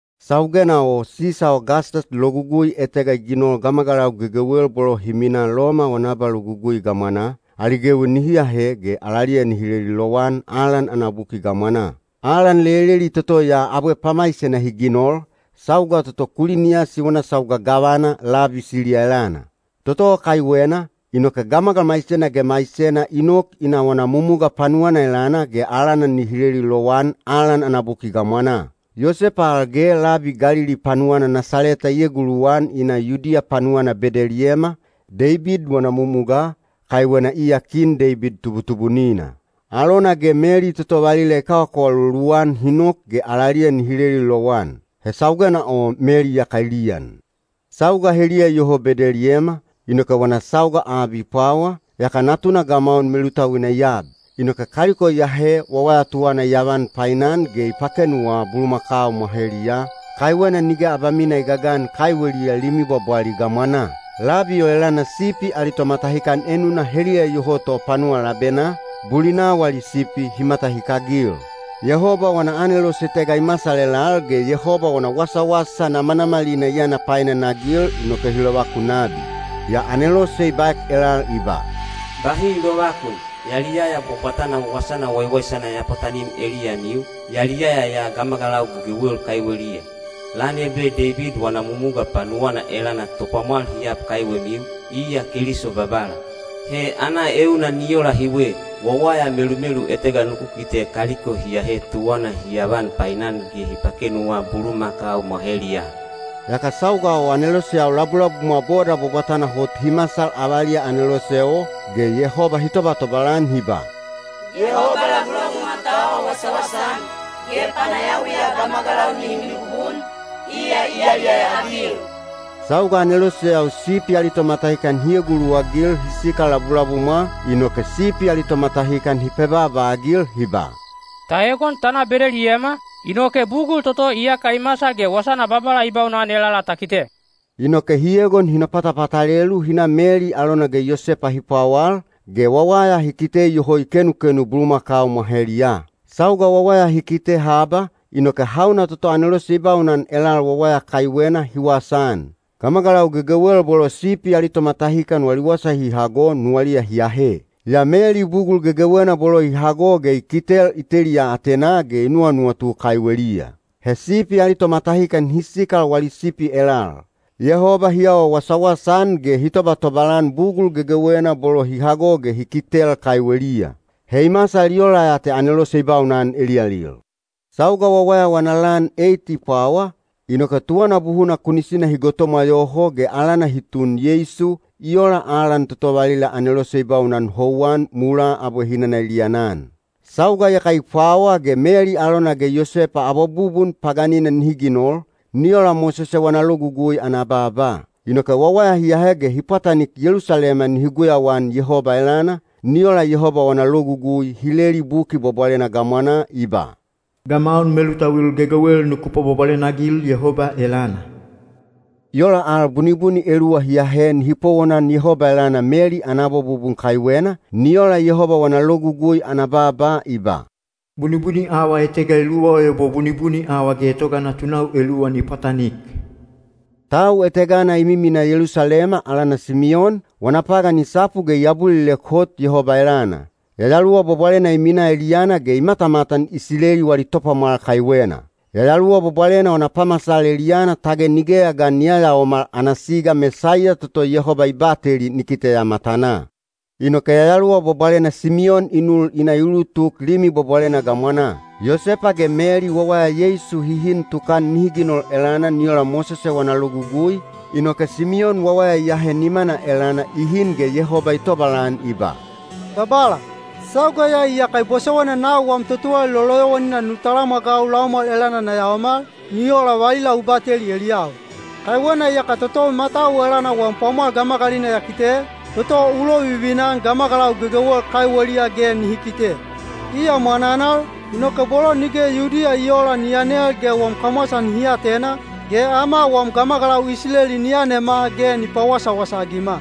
Saugena o Sisa Ogastas logugui etega i ginol gamagalau gegewel bolo hi minaa Loma wana abalogugui gamwanaa, ali gewi nihi ahe ge alaliya nihi leli lowan alan ana buki gamwanaa. Alan leleli toto ya abwe pamaisena hi ginol, sauga toto Kuliniyasi wana sauga gavana labi Siliya elana. Toto o kaiwena, inoke gamagal maisena ge maisena i nok i na wana mumuga panuwana elana ge alana nihi leli lowan alan ana buki gamwanaa. Yosepa al ge labi Galili panuwana Nasaleta i eguluwan i na Yudiya panuwana Bedeliyema, Deibid wana mumugaa, kaiwena iya kin Deibid tubutubunina. Alona ge Meli toto valila i kawakawalolu-an hi nok ge alaliya nihi leli lowan. He saugena o Meli iyaka i liyan. Sauga heliya iyoho Bedeliyema, inoke wana sauga ab i pwawa, yaka natuna gamaun melutauina i ab. Inoke kaliko i ahe wawaya tuwana i avan painan ge i pakenuwa bulumakau mwaheliyaa, kaiwena nige abamina i gagan kaiweliya limi bwabwali gamwanaa. Labi o elana sipi ali tomatahikan enuna heliya iyoho to panuwa labenaa, bulina wali sipi hi matahikagil. Yehoba wana anelose etega i masal elal ge Yehoba wana wasawasa namanamalina i yana painanagil inoke hi lovakun nabi. Yaa anelose i baek elal i ba, “Bahi lovakun! Yaliyaya bwabwatana wasana waiwaisana ya pwatanim eliyamiu, yaliyaya ya gamagalau gegewel kaiweliya. Lan ebe Deibid wana mumuga panuwana elana Topwamwal hi ab kaiwemiu, iya Keliso Babala. He ana euna ni ola hiwe: wawaya melumelu etega nuku kite kaliko hi ahe tuwana hi avan painan ge hi pakenuwa bulumakau mwaheliyaa.” Yaka sauga o aneloseyau labulabumwa boda bwabwatana hot hi masal avaliya anelose o, ge Yehoba hi tobatobal-an hi ba, “Yehoba labulabumwa ta awa wasawasa-an, ge panayawiya gamagalau nihi mibubun, iya i yaliyaya-agil.” Sauga aneloseyau sipi ali tomatahikan hi eguluwagil hi sikal labulabumwa, inoke sipi ali tomatahikan hi pebaaba-agil hi ba, “Ta egon ta na Bedeliyema, inoke bugul toto iyaka i masal ge wasana Babala i baunan elala ta kite.” Inoke hi egon hi nopatapatalelu hi na Meli alona ge Yosepa hi pwawal, ge wawaya hi kite iyoho i kenukenu bulumakau mwaheliyaa. Sauga wawaya hi kite haba, inoke hauna toto anelose i baunan elal wawaya kaiwena hi wasaan. Gamagalau gegewel bolo sipi ali tomatahikan wali wasa hi hago nuwaliya hi ahe. Yaa Meli bugul gegewena bolo i hago ge i kitel i teliya atenaa ge i nuwanuwatu kaiweliya. He sipi ali tomatahikan hi sikal wali sipi elal. Yehoba hi awa wasawasa-an ge hi tobatobal-an bugul gegewena bolo hi hago ge hi kitel kaiweliya. He i masal i ola ya te anelose i baunan eliyalil. Sauga wawaya wana lan eit i pwawa, inoke tuwana buhuna kunisina hi gotomwa yoho ge alana hi tun Yeisu, i ola alan toto valila anelose i baunan houwan mulaa abwe hinana i liyanan. Sauga iyaka i pwawa ge Meli alona ge Yosepa abwabubun paganina nihi ginol, ni ola Mosese wana logugui ana baaba. Inoke wawaya hi ahe ge hi pwatanik Yelusalema nihi guyauan Yehoba elana, ni ola Yehoba wana logugui hi leli Buki Bwabwalena gamwanaa i ba, “Gamaun melutauil gegewel nuku pwabwabwalena-agil Yehoba elana.” I ola al bunibuni eluwa hi ahe nihi powonan Yehoba elana Meli ana abwabubun kaiwena, ni ola Yehoba wana logugui ana baaba i ba, “Bunibuni awa etega eluwa o ebo bunibuni awa getoga natunau eluwa ni pwatanik.” Tau etegana i miminaa Yelusalema alana Simiyon, wana pagan i sapu ge i abulilek hot Yehoba elana. Yayaluwa Bwabwalena i minaa eliyana ge i matamatan Isileli wali Topwamwal kaiwena. Yayaluwa Bwabwalena wana pamasal eliyana tage nigeya ga ni yayaomal ana siga Mesaiya toto Yehoba i bateli ni kiteya matanaa. Inoke Yayaluwa Bwabwalena Simiyon i nul i na i ulutuk Limi Bwabwalena gamwanaa. Yosepa ge Meli wawaya Yeisu hi hin tukan nihi ginol elana ni ola Mosese wana Logugui, inoke Simiyon wawaya i ahe nimana elana i hin ge Yehoba i tobalan i ba: Babala, sauga ya iyaka bosowaina nau wam totuwalali loloyowanina nu talamwagau laumwal elana na yaomal, ni ola valila u bateli eliyau. Kaiwena iyaka totou matau elana wam pwamwal gamagalina ya kite, toto u lovivina-an gamagalau gegewel kaiweliya ge nihi kite. Iya mwananal, inoke bolo nige Yudiya i oola ni yanel ge wam kamwasa nihi atena, ge ama wam gamagalau Isileli ni yanema ge ni pawasawasa-agima.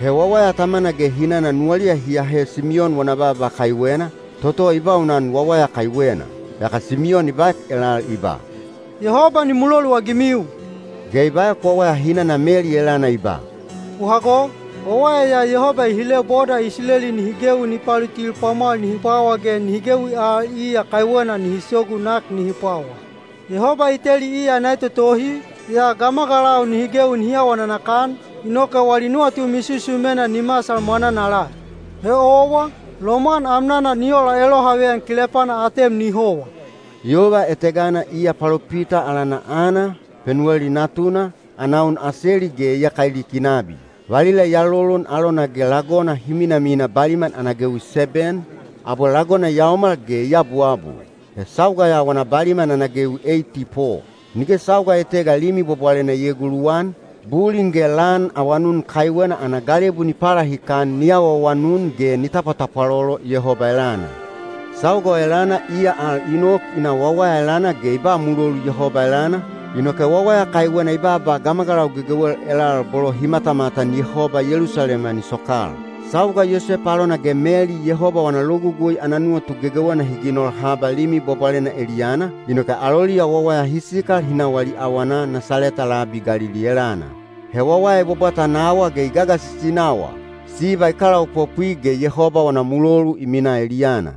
He wawaya tamana ge hinana nuwaliya hi ahe Simiyon wana baaba kaiwena, toto i baunan wawaya kaiwena. Yaka Simiyon i baek elal i ba, “Yehoba ni muloluagimiu,” ge i baek wawaya hinana Meli elana i ba, “U hago! Wawaya ya Yehoba i hile boda Isileli nihi gewi ni palutil pwamwal nihi pwawa ge nihi gewi al iya kaiwena nihi sogu nak nihi pwawa. Yehoba i teli iya ana etotohi, yaa gamagalau nihi gewi nihi awa nanakan, inoke wali nuwatu misusumena ni masal mwananala. He owa, lomwan amnana ni ola elohaveyan kilepana atem ni howa.” Yova etegana iya palopita alana Ana, Penuweli natuna, ana un Aseli ge iyaka i liki nabi. Valila i alolon alona ge lagona hi minamina baliman ana gewi seben, abwe lagona i yaomal ge i abuabul. He sauga ya wana baliman ana gewi eiti po. Nige sauga etega Limi Bwabwalena i eeguluwan, bulin ge lan awanun kaiwena ana galebu ni palahikan ni awaawanun ge ni tapwatapwalolo Yehoba elana. Sauga o elana iya al i nok i na wawaya elana ge i ba mulolu Yehoba elana, inoke wawaya kaiwena i baaba gamagalau gegewel elal bolo hi matamatan Yehoba Yelusalema ni sokal. Sauga Yosepa alona ge Meli Yehoba wana logugui ana nuwatu gegewena hi ginol haba Limi Bwabwalena eliyana, inoke aloliya wawaya hi sikal hi na wali awana Nasaleta labi Galili elana. He wawaya i bwabwata nawa ge i gagasisi nawa; siba i kalaopopwi ge Yehoba wana mulolu i minaa eliyana.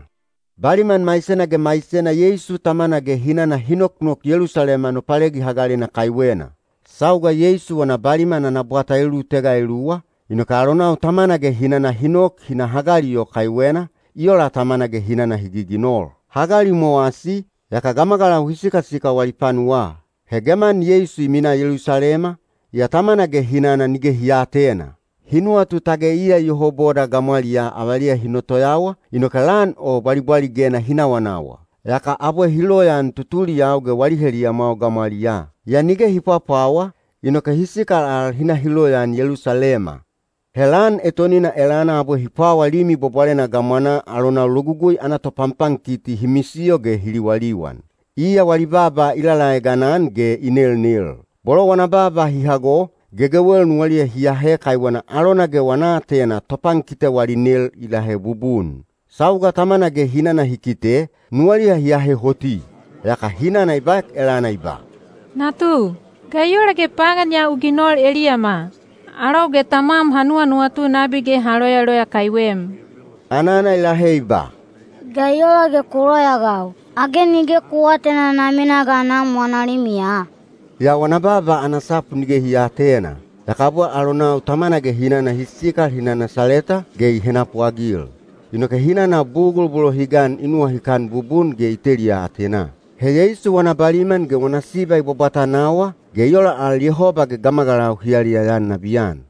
Baliman maisena ge maisena Yeisu tamana ge hinana hi noknok Yelusalema Nopalegi Hagalena kaiwena. Sauga Yeisu wana baliman ana bwata elulutega eluwa, inoke alonau tamana ge hinana hi nok hi na Hagali o kaiwena, i ola tamana ge hinana hi giginol. Hagali i mowasi, yaka gamagalau hi sikasikal wali panuwaa. He geman Yeisu i minaa Yelusalema, yaa tamana ge hinana nige hi aatena. Hi nuwatu tage iya iyoho boda gamwaliyaa avaliya hi notoyawa, inoke lan o bwalibwaligena hi nawanawa. Yaka abwe hi loyaan tutuliyau ge wali heliyamwau gamwaliyaa. Yaa nige hi pwapwawa, inoke hi sikal al hi na hi loyaan Yelusalema. He lan etonina elana abwe hi pwawa Limi Bwabwalena gamwanaa alonau logugui ana topanpankiti hi misiyo ge hi liwaliwan. Iya wali baaba i lalaegan-an ge i nelnel. Bolo wana baaba hi hago, gegewel nuwaliya hi ahe kaiwena alona ge wana aatena topankite wali nel i lahe bubun. Sauga tamana ge hinana hi kite, nuwaliya hi ahe hoti. Yaka hinana i baek elana i ba, “Natu, ga i ola ge pagan ya u ginol eliyama? Alou ge tamwam ha nuwanuwatu nabi ge ha loyaloya kaiwem.” Anana i lahe i ba, “Ga i ola ge ku loyaagau? Age nige ku aatena na minaa ga Nam wana limiya?” Yaa wana baaba ana sapu nige hi aatena. Yaka abwe alonau tamana ge hinana hi sikal hi na Nasaleta, ge i henapuagil. Inoke hinana bugul bolo hi gan i nuwahikan bubun ge i teliya atenaa. He Yeisu wana baliman ge wana siba i bwabwata nawa, ge i ola al Yehoba ge gamagalau hi yaliyaya-an nabiyan.